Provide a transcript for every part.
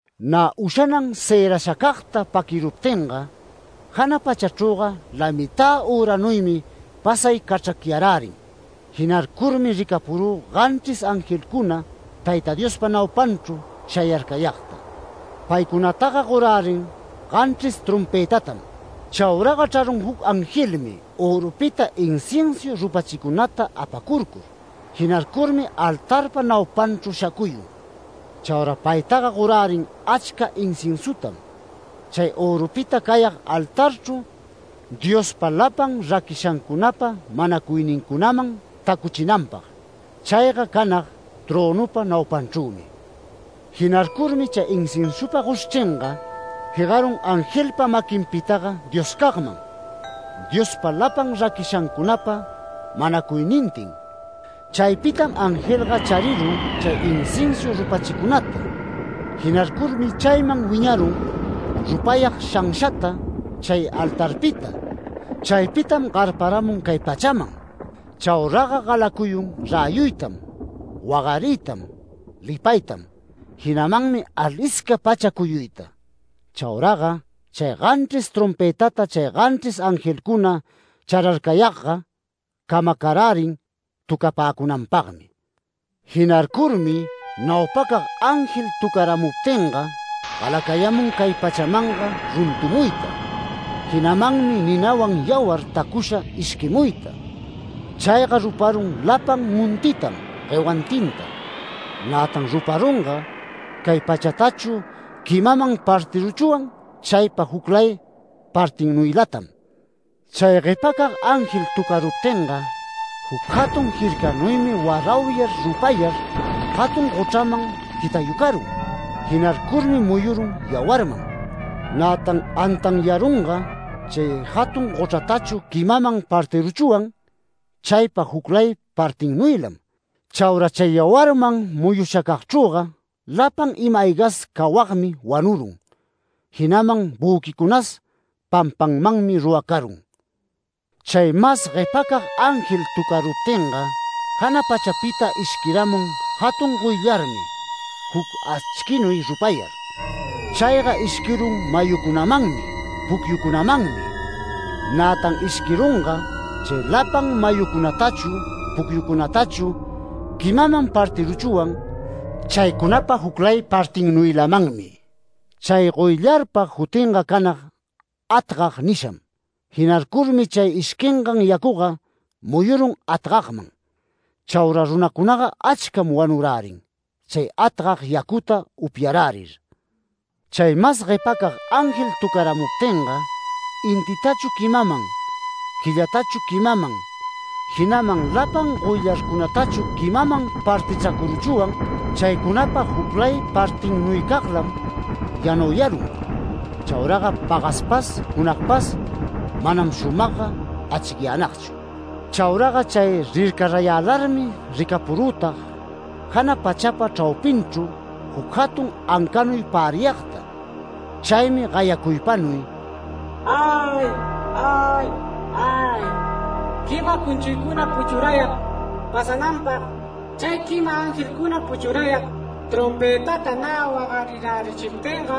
Nä ushanan cërashacagta paquiruptinga, jana pachachrüga lamitä üranuymi pasay cachracyarärin. Jinarcurmi ricapurü ganchris angelcuna Tayta Diospa naupanchru shayarcayagta. Paycunataga gorärin ganchris trompëtatam. Chauraga chrarun juc angelmi örupita inciensu rupachicunata apacurcur. Jinarcurmi altarpa naupanchru shacuyun. Chaura paytaga gorärin achca inciensutam, chay örupita cayag altarchru Diospa lapan raquishancunapa manacuynincunaman tacuchinanpag, chayga canag trönupa naupanchrümi. Jinarcurmi chay inciensupa goshchringa jegarun angelpa maquinpitaga Dioscagman, Diospa lapan raquishancunapa manacuynintin. Chaypitam angelga charirun chay inciensu rupachicunata. Jinarcurmi chayman wiñarun rupayag shanshata chay altarpita. Chaypitam garparamun cay pachaman. Chauraga galacuyun räyuytam, wagariytam, lipaytam, jinamanmi alisca pacha cuyuyta. Chauraga chay ganchris trompëtata chay ganchris angelcuna chararcayagga camacarärin töcapäcunanpagmi. Jinarcurmi naupacag ángel töcaruptinga galacayamun cay pachamanga runtumuyta, jinamanmi ninawan yawar tacusha ishquimuyta. Chayga ruparun lapan montitam guewantinta. Nätan ruparunga, cay pachatachu quimaman partiruchwan chaypa juclay partinnuylatam. Chay guepacag ángel töcaruptinga, juc jatun jircanuymi warauyar rupayar jatun gochraman jitayucarun. Jinarcurmi muyurun yawarman. Nätan antanyarunga, chay jatun gochratachu quimaman partiruchwan chaypa juclay partinnuylam. Chaura chay yawarman muyushacagchrüga lapan ima-aygas cawagmi wanurun, jinaman büquicunas pampanmanmi ruracarun. Chay mas guepacag ángel töcaruptinga jana pachapita ishquiramun jatun goyllarmi juc achquinuy rupayar. Chayga ishquirun mayucunamanmi pucyucunamanmi. Nätan ishquirunga, chay lapan mayucunatachu pucyucunatachu quimaman partiruchwan chaycunapa juclay partinnuylamanmi. Chay goyllarpa jutinga canag ‘Atgag’ nisham. Jinarcurmi chay ishquingan yacuga muyurun atgagman. Chaura runacunaga achcam wanurärin chay atgag yacuta upyarärir. Chay mas guepacag ángel töcaramuptinga, intitachu quimaman, quillatachu quimaman, jinaman lapan goyllarcunatachu quimaman partichracuruchwan chaycunapa juclay partinnuycaglam yanauyarun, chauraga pagaspas junagpas manam shumagga achicyänagchu. Chauraga chay rircarayälarmi ricapurütag jana pachapa chraupinchru juc jatun ancanuy päriyagta. Chaymi gayacuypanuy “¡Ay! ¡Ay! ¡Ay! Quima cunchuycuna puchurayag pasananpag chay quima angelcuna puchurayag trompëtata nä wagarirärichiptinga,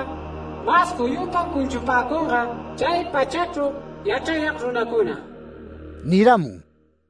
mas juyupam cunchupäcunga chay pachachru yachrayag runacuna” niramun.